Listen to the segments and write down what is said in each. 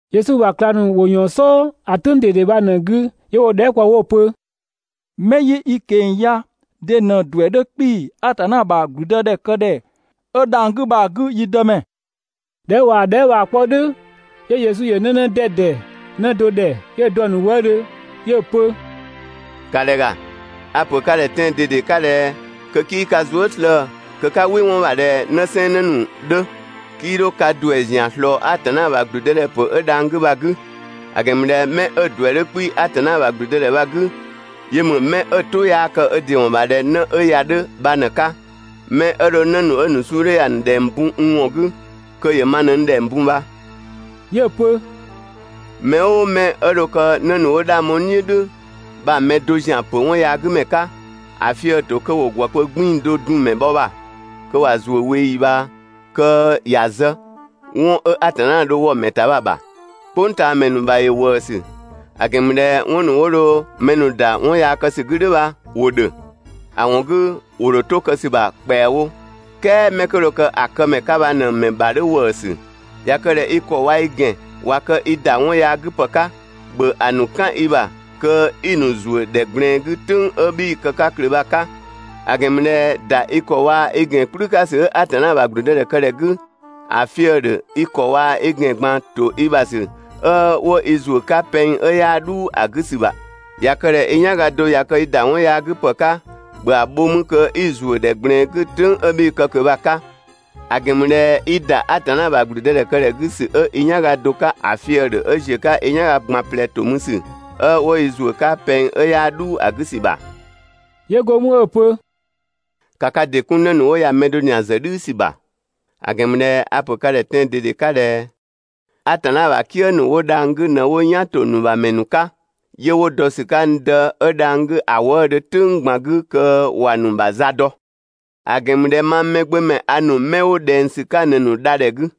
Yesu ‑bha ꞊klang ‑nu ‑wo ‑yɔɔn "sɔɔ ‑a "tʋ̈ng ꞊dede bha ꞊në‑ 'gü 'yö 'wo‑ dhɛɛ" kpɔ 'wo‑ pö: «'Mɛ 'yi i ꞊keng‑ ya de ꞊në ‑duɛ 'dhö 'kpii‑ Atanna ‑bha ‑gblüdëdhɛkëdhɛ 'ö dhang‑ 'gü bha‑ 'gü, yi Dëmɛ?» ꞊Dhɛ 'ö ꞊waa‑ dhɛɛ" bha‑ 'kpɔ "dhʋ̈, 'yö Yesu ‑yö 'në 'në 'dɛdɛ 'në do ‑dhɛ, 'yö‑ dɔ‑ ‑nu wëëdhö 'yö‑ pö: «‑Ka ‑dhɛ ‑ga, a‑ ‑pö ka ‑dhɛ tɛan‑ ꞊dede 'ka ꞊dhɛ kö 'kii ka zuë" slëë‑ kö 'ka "wɩ 'wɔn ‑bha ꞊dhɛ 'në 'sɛnsɛn 'në ‑nu 'dhö 'kii 'dho ka ‑duɛ ‑zian ꞊slɔɔ Atanna ‑bha ‑gblüdëdhɛpö 'ö dhang‑ 'gü bha‑ 'gü. ‑A ‑gɛn ‑mü ꞊dhɛ 'mɛ 'ö‑ ‑duɛ 'dhö 'kpii‑ Atanna ‑bha ‑gblüdëdhɛ bha‑ 'gü, yö ‑mü 'mɛ 'ö‑ "tʋ 'yaa kë ö ‑dɩ ‑wɔn ‑bha ꞊dhɛ 'në 'ö ya‑ 'dhö bha ꞊në‑ 'ka. 'Mɛ 'ö dho 'në ‑nu 'ö‑ ‑nu suu 'dhö ya‑ ‑nu ‑dhɛng bun n ‑wɔn 'gü, kö ‑yö ma ꞊në n ‑dhɛng bun bha.» 'Yö‑ pö: «Mɛ "ʋʋ 'mɛ 'ö dho kë 'në ‑nu 'wo 'dhang bho n "dhiʋ̈ "dhʋ̈ bha‑ mɛ do ‑zian ‑pö 'wɔn yaa 'gü ‑mɛ 'ka, ‑a fië‑ ‑to kö ‑wo ‑gwë kpö 'gbiin‑ do dun‑ ‑mɛ bhɔ ‑bha kö ꞊wa ‑zuö 'ka ꞊weeyi ꞊bhaa kö ‑ya zë ('wɔn 'ö Atanna dho‑ wɔ‑ ‑ta bha‑ ‑bha). "Kpʋngtaamɛ ‑nu ‑bha ‑yö ‑wëësü, ‑a ‑gɛn ‑mü ꞊dhɛ 'wɔn ‑nu 'wo dho mɛ ‑nu ‑da 'wɔn yaa kë ‑sü 'gü "dhʋ̈ bha ‑wo ‑dhö. ‑A ‑wɔn 'gü ‑wo ‑dho 'to kë ‑sü ‑bha ‑kpɛawo, "kɛɛ 'mɛ 'kö dho kë ‑a kë ‑mɛ 'ka bha ꞊në‑ ‑mɛ ‑bha 'dhö ‑wëësü! ꞊Ya kë ꞊dhɛ i ‑kɔ waa‑ i ‑gɛn ꞊wa kë i ‑da 'wɔn yaa 'gü ‑pë 'ka, ‑bhö ‑a ‑nu "kan i ‑bha kö 'i‑ ‑nu ‑zuö ‑dhɛ ꞊gblɛɛn 'gü ("tʋ̈ng 'ö 'bhii‑ kë ꞊kö bha‑ 'ka). ‑A ‑gɛn ‑mü ꞊dhɛ ‑da i ‑kɔ waa‑ i ‑gɛn "kplü 'ka ‑sü 'ö Atanna ‑bha ‑gblüdëdhɛkëdhɛ 'gü, ‑a fië‑ ‑dhö i ‑kɔ waa‑ i ‑gɛn ꞊gban ‑to i ‑bha ‑sü 'ö 'wo i ‑zuö 'ka pɛng 'ö 'yaa "dhuu ‑a 'gü ‑sü ‑ta. ꞊Ya kë ꞊dhɛ i "yanga do ꞊ya kë i ‑da 'wɔn yaa 'gü ‑pë 'ka, ‑bhö ‑a bho 'mü kö 'i‑ ‑zuö ‑dhɛ ꞊gblɛɛn 'gü ("tʋ̈ng 'ö 'bhii‑ kë ꞊kö bha‑ 'ka), ‑a ‑gɛn ‑mü ꞊dhɛ i ‑da Atanna ‑bha ‑gblüdëdhɛkëdhɛ 'gü ‑sü 'ö i "yanga do 'ka, ‑a fië‑ ‑dhö 'ö ‑ziö 'ka i "yanga ꞊gban ꞊plɛ ‑to mü ‑sü 'ö 'wo i ‑zuö 'ka pɛng 'ö 'yaa "dhuu ‑a 'gü ‑sü ‑ta.» 'Yö go mü 'ö‑ pö: «‑Ka ka ‑dɩ 'kun 'në ‑nu 'wo ya‑ mɛ do ‑zian ‑zë "dhiisü ‑bha! ‑A ‑gɛn ‑mü ꞊dhɛ 'a‑ pö ka ‑dhɛ tɛan‑ ꞊dede 'ka ꞊dhɛ: Atanna ‑bha "kië ‑nu 'wo dhang‑ 'gü ꞊në 'wo "yan ‑to ‑nu ‑bha ‑mɛ ‑nu 'ka, 'yö 'wo dɔ ‑sü 'ka n Dë 'ö dhang‑ 'gü ‑a wëëdhö "tʋ̈ng ꞊gban 'gü (kö ‑wa ‑nu ‑bha za dɔ). [‑A ‑gɛn ‑mü ꞊dhɛ mang Mɛgbömɛ a ‑nu 'mɛ 'wo ꞊dhɛng ‑sü 'ka ꞊në‑ ‑nu dha ‑dhɛ 'gü.]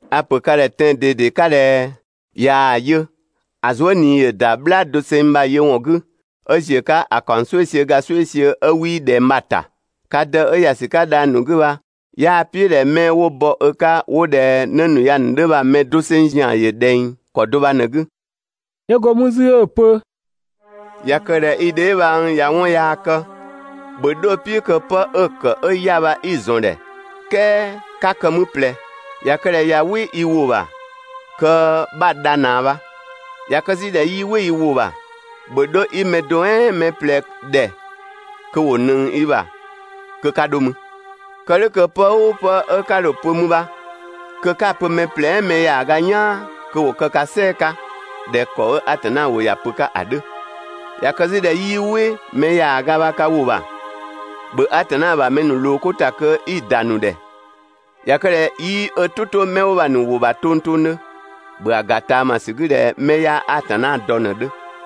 A‑ ‑pö ka ‑dhɛ tɛan‑ ꞊dede 'ka ꞊dhɛ: ꞊Yaa‑ yö, ‑a zuë" ꞊nii ‑yö ‑da "bhlaa doseng bha‑ yö ‑wɔn 'gü, 'ö ‑ziö 'ka ‑a ‑kaɔng "sueisiö ga "sueisiö 'ö 'wii ꞊dhɛng bha‑ ‑ta. Ka Dë 'ö ‑ya ‑sü 'ka dhang‑ ‑nu 'gü bha, 'yaa‑ "piʋ̈ ꞊dhɛ 'mɛ 'wo (bɔ ö 'ka 'wo) ꞊dhɛ 'në ‑nu ya 'dhö bha‑ mɛ doseng ‑zian ‑yö ꞊dhɛng ‑kɔ do bha ꞊në‑ 'gü.» 'Yö go mü 'zü 'ö‑ pö: ꞊Ya kë ꞊dhɛ i dheebhang ꞊ya 'wɔn yaa kë, ‑bhö 'dho‑ "piʋ̈ kö 'pë 'ö‑ ‑kë 'ö 'ya‑ bha 'i‑ ‑zɔn ‑dhɛ, "kɛɛ 'ka kë 'mü ꞊plɛ. ꞊Ya kë ꞊dhɛ ꞊ya "wɩ i ‑wʋ ‑bha kö 'bha‑ dha ꞊naa bha. ꞊Ya kë 'zü ꞊dhɛ 'yii "wɩ i ‑wʋ ‑bha, ‑bhö 'dho 'i mɛ do "ɛɛn mɛ ꞊plɛ ‑dhɛ kö ‑wo ꞊nëng i ‑bha kö 'ka 'dho mü. Kë "dhʋ̈ kö pë "ʋʋ pë 'ö 'ka dho‑ pö 'mü bha kö 'ka‑ pö mɛ ꞊plɛ "ɛɛn mɛ ‑yaaga "yaan kö ‑wo kë ka "sɛɛ‑ 'ka ꞊dhɛ ‑kɔ 'ö Atanna ‑wʋ ‑ya pö‑ 'ka‑ 'dhö. ꞊Ya kë 'zü ꞊dhɛ 'yii "wɩ mɛ ‑yaaga bha ka ‑wʋ ‑bha, ‑bhö Atanna ‑bha mɛ ‑nu ꞊loo 'ko ‑ta kö 'i‑ ‑da ‑nu ‑dhɛ. ꞊Ya kë ꞊dhɛ 'yii ö "tʋ 'to mɛ 'wo bha‑ ‑nu ‑wʋ ‑bha tongtongdhö, ‑bhö ‑a ‑ga ꞊taamasü 'gü ꞊dhɛ 'mɛ 'yaa Atanna dɔ ꞊në‑ 'dhö.»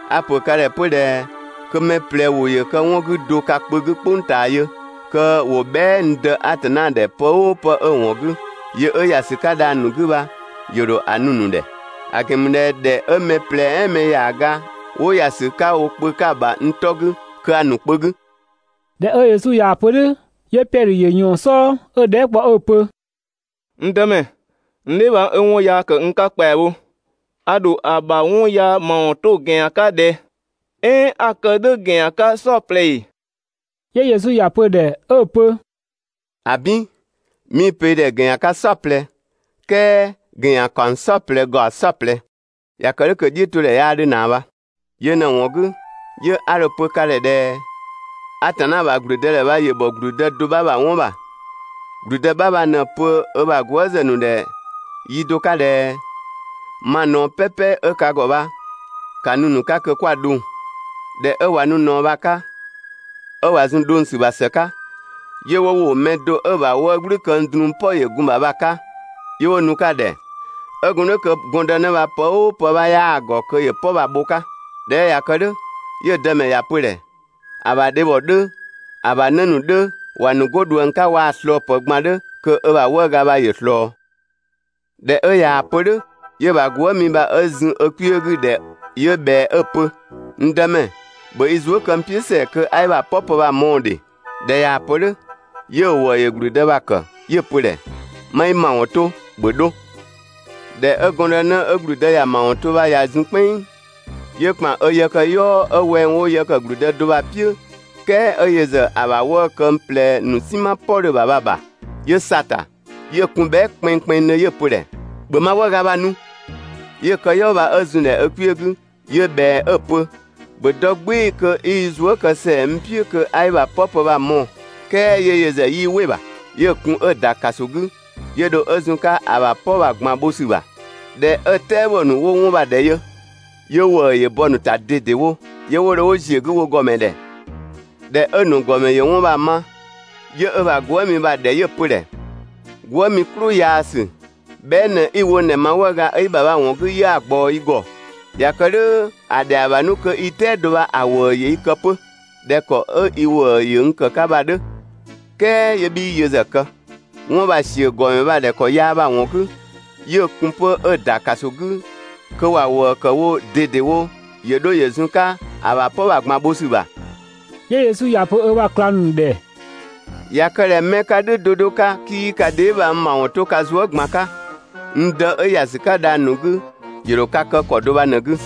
A‑ ‑pö ka ‑dhɛ 'pö ꞊dhɛ: Kö mɛ ꞊plɛ ‑wʋ ‑yö kë 'wɔn 'gü do ka kpö 'gü "kpʋng ꞊taa yö, kö ‑wo bhɛa" n Dë Atanna ‑dhɛ pë "ʋʋ pë 'kö‑ ‑wɔn 'gü, yö 'ö ‑ya ‑sü 'ka dhang‑ ‑nu 'gü bha, ‑yö ‑dho ‑a nu‑ ‑nu ‑dhɛ. ‑A ‑gɛn ‑mü ꞊dhɛ ‑dhɛ 'ö mɛ ꞊plɛ "ɛɛn mɛ ‑yaaga 'wo ‑ya ‑sü 'ka wo kpö 'ka‑ ‑bha n 'tɔ 'gü, kö a‑ ‑nu kpö 'gü. ꞊Dhɛ 'ö Yesu ꞊yaa‑ pö "dhʋ̈, 'yö Piɛdhö ‑yö ꞊yɔɔn‑ "sɔɔ 'ö‑ dhɛɛ" kpɔ 'ö‑ pö: «N Dëmɛ, n dheebhang 'ö 'wɔn yaa ‑kë n 'ka ‑kpɛawo, a ‑dho ‑a ‑bha 'wɔn yaa ‑mawɔn 'to ‑gɛn ‑yan 'ka ꞊dhɛ? "Ɛɛn 'a‑ kë "dhʋ̈ ‑gɛn ‑yan 'ka "saɔplɛ ‑ee?» 'Yö Yesu ‑ya pö‑ ‑dhɛ 'ö‑ pö: «‑Abin! 'Mii‑ pö i ‑dhɛ ‑gɛn ‑yan 'ka "saɔplɛ, "kɛɛ ‑gɛn ‑yan ‑kaɔng "saɔplɛ ‑gaɔ "saɔplɛ. (꞊Ya kë "dhʋ̈ kö‑ "dhiʋ̈todhɛ 'yaa 'dhö ꞊naa bha.) Yö ꞊në‑ ‑wɔn 'gü, 'yö 'a dho‑ pö ka ‑dhɛ ꞊dhɛ: Atanna ‑bha ‑gblüdëdhɛ bha ‑yö ‑bhɔ ‑gblüdë do 'bha ‑bha 'wɔn ‑bha. ‑Gblüdë 'bha bha ꞊në‑ pö ö ‑bha gwëëzë ‑nu ‑dhɛ yi do 'ka ꞊dhɛ: «Ma ꞊naɔ "pɛpɛ 'ö ka ‑gɔ bha, ‑ka nu‑ 'ka kö 'kwa‑ dhʋng!» ꞊Dhɛ 'ö ꞊wa nu ꞊naɔ bha‑ 'ka, 'ö ꞊wa zun‑ dhʋng ‑sü ‑bha ‑së 'ka, 'yö 'wo ‑wo mɛ do 'ö‑ ‑bha 'wëë‑ "gblü këng drun "pɔ ‑yö gun‑ ‑bha bha‑ 'ka, 'yö 'wo nu‑ 'ka‑ ‑dhɛ. 'Ö gun "dhʋ̈ kö gɔndënë bha pë "ʋʋ pë 'bha 'yaa‑ ‑gɔ kö ‑yö "pɔ bha‑ bho‑ 'ka. ꞊Dhɛ 'ö ꞊ya kë "dhʋ̈, 'yö‑ dëmɛ ‑ya pö‑ 'dhö, ‑a ‑bha dhebhɔ 'dhö, ‑a ‑bha 'në ‑nu 'dhö, ‑wa nu 'go ꞊dhuëng 'ka waa‑ ꞊slɔɔpë ꞊gban 'dhö kö ö ‑bha 'wëëga bha ‑yö ꞊slɔɔ. ꞊Dhɛ 'ö ꞊yaa‑ pö "dhʋ̈, 'yö‑ ‑bha gwëëmi bha 'ö zun ö kpiö 'gü‑ ‑dhɛ 'yö ꞊bhɛa 'ö‑ pö: «N Dëmɛ, ‑bhö i zuë" kë ‑sɛa n "piʋ̈ kö 'a i ‑bha "pɔ pë bha‑ mɔɔ‑ ‑dhe!» ꞊Dhɛ ꞊yaa‑ pö "dhʋ̈, 'yö‑ ‑wëë 'dhö ‑gblüdë bha‑ ‑kë 'yö‑ pö‑ ‑dhɛ: «'Ma i ‑mawɔn 'to, ‑bhö 'dho!» ꞊Dhɛ 'ö gɔndënë 'ö ‑gblüdë ‑ya ‑mawɔn 'to bha ꞊ya zun "kpɛnng, 'yö ‑kpan ö yëkëyɔɔ 'ö wɛng 'wo yë ‑kë ‑gblüdë do bha‑ "piʋ̈, "kɛɛ 'ö yö ‑zë ‑a ‑bha 'wëë‑ këng ꞊plɛ ‑nu "sinma "pɔ 'dhö‑ ‑bha bha‑ ‑bha. 'Yö sa‑ ‑ta, 'yö kun bhɛa" kpɛnngkpɛnngdhö 'yö‑ pö‑ ‑dhɛ: «‑Bhö ma 'wëëga bha‑ nu!» 'Yö‑ yëkëyɔɔ bha 'ö zun‑ ‑dhɛ kpiö 'gü, 'yö ꞊bhɛa 'ö‑ pö: «‑Bhö dɔ "gbɩɩ‑ kö 'i i zuë" kë ‑sɛa n "piʋ̈ kö 'a i bha "pɔ pë 'ö bha‑ mɔɔ‑!» "Kɛɛ 'yö yö ‑zë 'yii "wɩ‑ ‑bha, 'yö‑ kun 'ö‑ ‑da ‑kaso 'gü 'yö dho ö zun‑ 'ka ‑a ‑bha "pɔ bha‑ ꞊gban bho ‑sü ‑bha. ꞊Dhɛ 'ö‑ "tɛabɔ ‑nu 'wo 'wɔn bha‑ ‑dhɛ yö, 'yö ‑wëë ‑yö bɔ‑ ‑nu ‑ta ꞊dedewo, 'yö 'wo dho 'wo ‑ziö 'gü wo ‑gɔmɛ ‑dhɛ. ꞊Dhɛ 'ö‑ ‑nu ‑gɔmɛ ‑yö 'wɔn bha‑ ma, 'yö ö ‑bha gwëëmi bha‑ ‑dhɛ 'yö‑ pö‑ ‑dhɛ: «Gwëë" "klʋ yaasü! Bhɛa" ꞊në 'i‑ wo n ‑dhɛ ma 'wëëga 'ö i ‑bha bha‑ ‑wɔn 'gü 'yö 'a‑ ꞊gbaɔ i ‑gɔ. ꞊Ya kë "dhʋ̈ ‑a ‑dhɛa bha 'nu kö i "tɛado bha‑ ‑wëë ‑yö i kë 'pö ꞊dhɛ ‑kɔ 'ö i ‑wëë ‑yö n ‑kë 'ka bha‑ 'dhö, "kɛɛ 'yö 'bhii yö ‑zë kë.» 'Wɔn bha‑ ‑siö ‑gɔmɛ bha‑ ‑bha ‑kɔ yaa bha‑ ‑wɔn 'gü, 'yö‑ kun 'pö 'ö‑ ‑da ‑kaso 'gü kö ‑wa ‑wëë ‑kë wo ꞊dedewo ‑yö 'dho ‑yö zun‑ 'ka ‑a ‑bha "pɔ bha‑ ꞊gban bho ‑sü ‑bha. 'Yö Yesu ‑ya pö ö ‑bha ꞊klang ‑nu ‑dhɛ: «꞊Ya kë ꞊dhɛ 'mɛ 'ka "dhʋ̈ 'do 'do 'ka 'kii ka dheebhang ‑mawɔn 'to ka zuë" ꞊gban 'ka, n Dë 'ö ‑ya ‑sü 'ka dhang‑ ‑nu 'gü, ‑yö ‑dho ka kë ‑kɔ do bha ꞊në‑ 'gü.